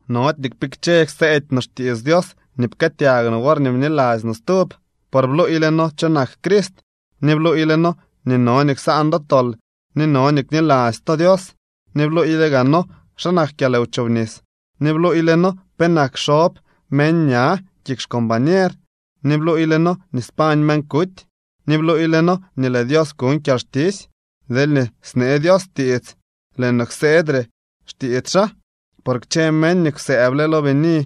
Nody nii kpikche kseedy no xtiits Dios nii pkëëtyag no worñee bniladzy no stub, por bluuyle noo cho nak Crist, ni bluuyle noo nii no nii ksaan do tol ni no nii kniladzy to Dios. Ni bluuyle gaa noo xa nak kyalwchobnis, ni bluuyle noo penak xob meñ ña kik xcombañer, ni bluuyle noo nii spañ meñ kuty, ni bluuyle noo nii lëë Dios kuñ kyalxtisy. Deelñee snee Dios tiits, lëë no kseedyre tiits xaa. Por kchë meñ nii kwsëëble lo bini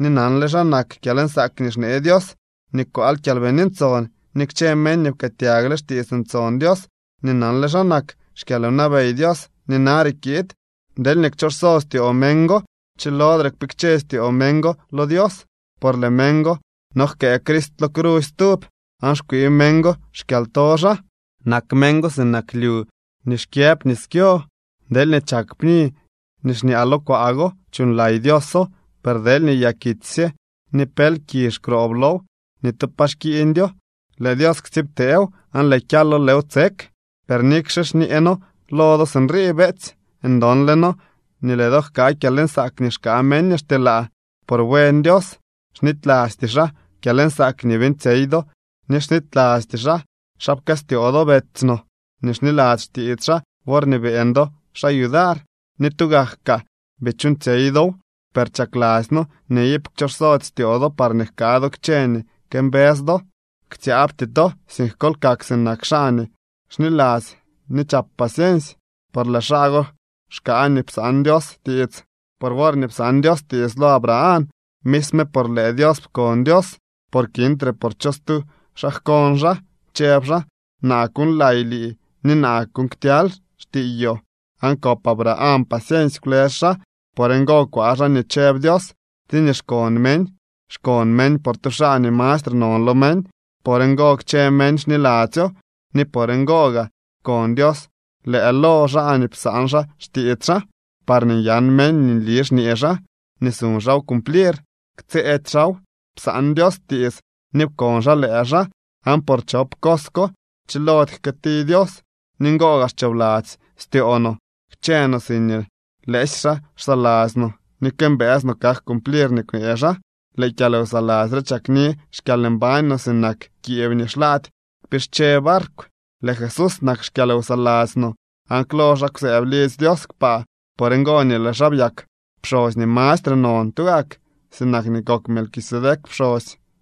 ni nanle xa nak kyalnsaak nii xnee Dios ni kwaal Kyalbini Ntson, ni kchë meñ nii pkëëtyagle xtiits ntson Dios ni nanle xa nak xkyalwnabey Dios nii nare kiid, deelñee kchooxso styoo meñ go, chilodre kpikche styoo meñ go lo Dios, por lëë meñ go nojkëë Crist lo crusy stub, aan xkwii meñ go xkyalto xaa. Nak meñ go sinak lyu nii xkyëb nis kyo. Deelñee chak pni nii xñaa lo kwaa go, chuuñlay Dioso, per deelñee yakitsy sye ni pel kizh xroob low, ni tu pa xkiiñdyo. Lëë Dios ktsiibteew aan lëë kyalo lëëw tsek. Per nikxe xñee noo lo do sinrii, beetsy, ndonle noo nii lëë do jkaa kyalnsaak nii xkaa meñ nii xtyelaa. Por buen Dios. Xnitylasty xaa kyalnsaak nii beeñtsyey do ni xnitylasty xaa xa pkëstyoo do betsy no nii xniladzy xtiits xaa worñee beeñ do xaa yudar, ni tugak kaa bii chuuñtsyey dow. Per chakladzy noo nii iip kchooxsody styoo do parñee jkaa do kchë nii këmbës do. Ktsyaabty to, sink kol kak sinak xaa nii xniladzy ni chap paciensy, por lëë xaa go xkaa nii psaan Dios tiits. Por worñee psaan Dios tiits lo Abraham, misme por lëë Dios pkon Dios, por kintre por cho stu xaa jkon xaa. Chëb xaa: “Naa kuuñlay lii ni naa kuuñ ktyaly xtiiyoo.” Aan kop Abraham paciensy, kwlës xaa. Por ngo kwaa xaa nii chëb Dios. Tsiñee xkon meñ, xkon meñ por tu xaa nii mastre non lo meñ. Por ngo kchë meñ xniladzyo. Ni por ngo gaa pkon Dios lëë lo xaa nii psaan xaa xtiits xaa, parñee nyan meñ nii nli xñee xaa, nii suñ xaaw cumplir. Ktsëëdy xaaw. Psaan Dios tiits ni pkon xaa lëë xaa, aan por chop cos ko chilody jkëëti Dios. Ni ngo gaa xchoobladzy styoo no kchë no siñee lëësy xaa xsaladzy no ni këmbëës no kak cumplir nii kwnee xaa. Lëë kyalwsaladzy re chakni xkyalmbañ no, sinak kiib nii xlaady kpische barkw. Lëë Jesús nak xkyalwsaladzy no aan klo xaa kwsëëb lidzy Dios kpaa. Por ngo nii lëë xaa byak pxosy nii mastre non tugak, sinak nii kok Melquisedec pxosy.